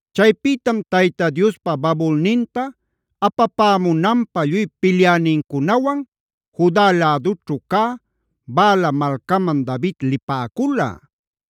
Chaypïtam Tayta Diospa babulninta apapämunanpä lluy pilyänincunawan Juda lädućhu cä Baala malcaman David lipäcula.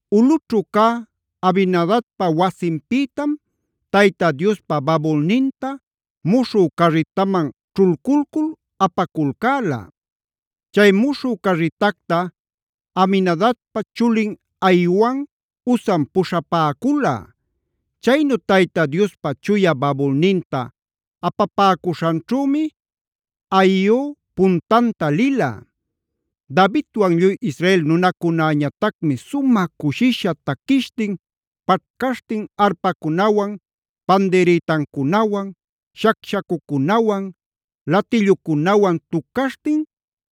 Ulꞌućhu cäb Abinadabpa wasinpïtam Tayta Diospa babulninta muśhü carritaman ćhulculcul apaculcäla. Chay muśhü carritacta Abinadabpa chulin Ahiowan Uzam puśhapäcula. Chaynu Tayta Diospa chuya babulninta apapäcuśhanćhümi Ahio puntanta lila. Davidwan lluy Israel nunacunäñatacmi sumä cushisha taquishtin, paćhcaśhtin arpacunawan, pandirïtancunawan, shacshacuncunawan, latillucunawan tucaśhtin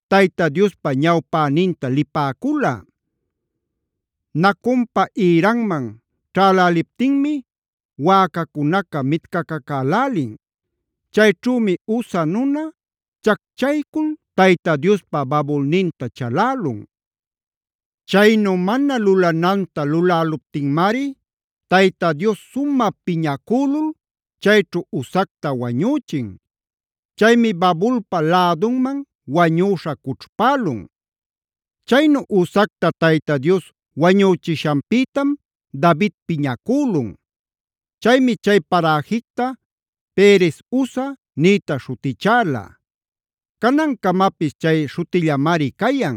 Tayta Diospa ñawpäninta lipäcula. Naconpa ïranman ćhäläliptinmi wäcacunaca mitcacacälälin. Chayćhümi Uza nuna chacchaycul Tayta Diospa babulninta chalälun. Chaynu mana lulananta luläluptinmari Tayta Dios sumä piñacülul chayćhu Uzacta wañüchin.c Chaymi babulpa lädunman wañüśha cućhpälun. Chaynu Uzacta Tayta Dios wañüchishanpïtam David piñacülun. Chaymi chay paräjicta Perez-uzad nïta śhutichäla. Canancamapis chay śhutillamari cayan.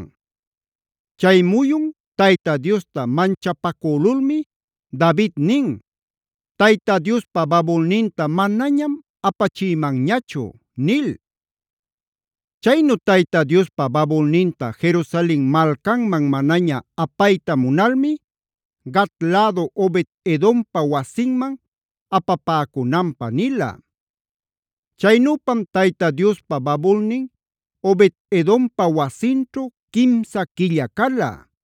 Chay muyun Tayta Diosta manchapacülulmi David nin: “Tayta Diospa babulninta manañam apachïmanñachu” nil. Chaynu Tayta Diospa babulninta Jerusalen malcanman manaña apayta munalmi Gat lädu Obed-edompa wasinman apapäcunanpä nila. Chaynüpam Tayta Diospa babulnin Obed-edompa wasinćhu quimsa quilla cala.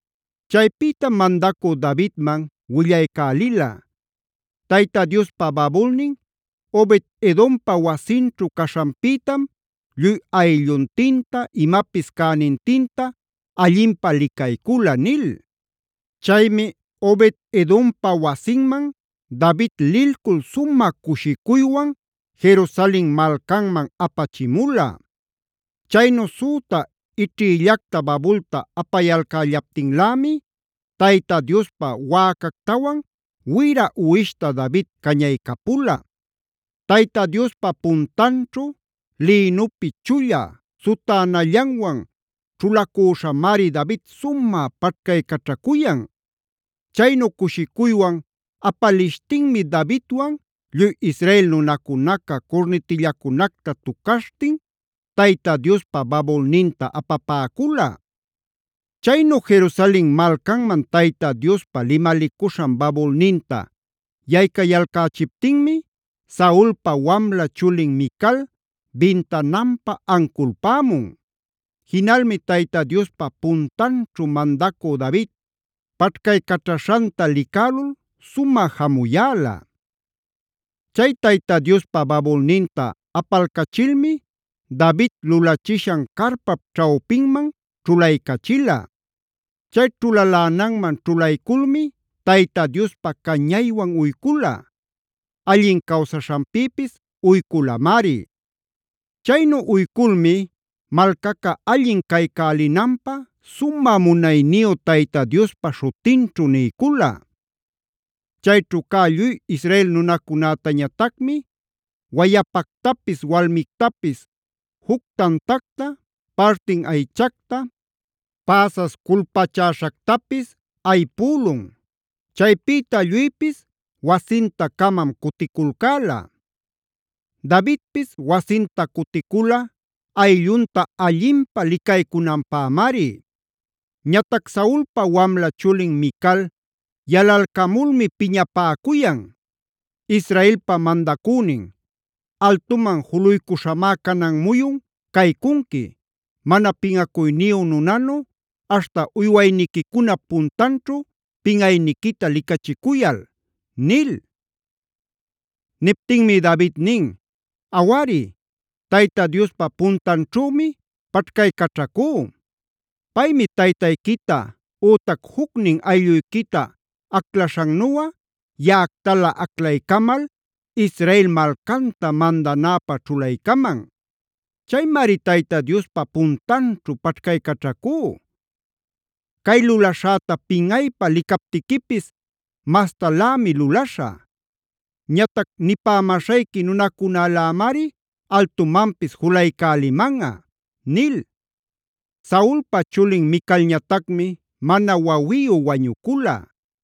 Chaypïtam mandacü Davidman willaycälila: “Tayta Diospa babulnin Obed-edompa wasinćhu caśhanpïtam lluy aylluntinta, imapis cänintinta allinpä licaycula” nil. Chaymi Obed-edompa wasinman David lilcul sumä cushicuywan Jerusalen malcanman apachimula. Chaynu süta ićhïllacta babulta apayalcällaptinlämi Tayta Diospa wäcactawan wira uwishta David cañaycapula. Tayta Diospa puntanćhu lïnupi chulla sutänallanwan ćhulacüśhamari David sumä paćhcaycaćhacuyan. Chaynu cushicuywan apalishtinmi Davidwan lluy Israel nunacunaca curnitillacunacta tucaśhtin Tayta Diospa babulninta apapäcula. Chaynu Jerusalen malcanman Tayta Diospa limalicuśhan babulninta yaycayalcächiptinmi Saulpa wamla chulin Mical bintananpa anculpämun. Jinalmi Tayta Diospa puntanćhu mandacü David paćhcaycaćhaśhanta licälul sumä jamuyäla. Chay Tayta Diospa babulninta apalcachilmi David lulachishan carpap ćhawpinman ćhulaycachila. Chay ćhulalänanman ćhulayculmi Tayta Diospa cañaywan uycula; allin cawsaśhanpïpis uyculamari. Chaynu uyculmi malcaca allin caycälinanpä sumä munayniyu Tayta Diospa śhutinćhu niycula. Chayćhu cä lluy Israel nunacunätañatacmi wayapactapis walmictapis juc tantacta, partin aychacta, päsas culpachäśhactapis aypülun. Chaypïta lluypis wasinta-camam cuticulcäla. Davidpis wasinta cuticula ayllunta allinpä licaycunanpämari.f Ñatac Saulpa wamla chulin Mical yalalcamulmi piñapäcuyan: “Israelpa mandacünin, ¡altuman juluycuśhamá canan muyun caycunqui, mana pinꞌacuyniyu nunanu aśhta uywayniquicunap puntanćhu pinꞌayniquita licachicuyal!” nil. Niptinmi David nin: “Awari, Tayta Diospa puntanćhümi paćhcaycaćhacú. Paymi taytayquita ütac jucnin aylluyquita aclaśhannuꞌa yaꞌactalä aclaycamal Israel malcanta mandanäpä ćhulaycaman. Chaymari Tayta Diospa puntanćhu paćhcaycaćhacú. Cay lulaśhäta pinꞌaypa licaptiquipis mastalämi lulaśhä. Ñatac nipämäśhayqui nunacunälämari altumanpis julaycälimanꞌa” nil. Saulpa chulin Micalñatacmi mana wawiyu wañucula.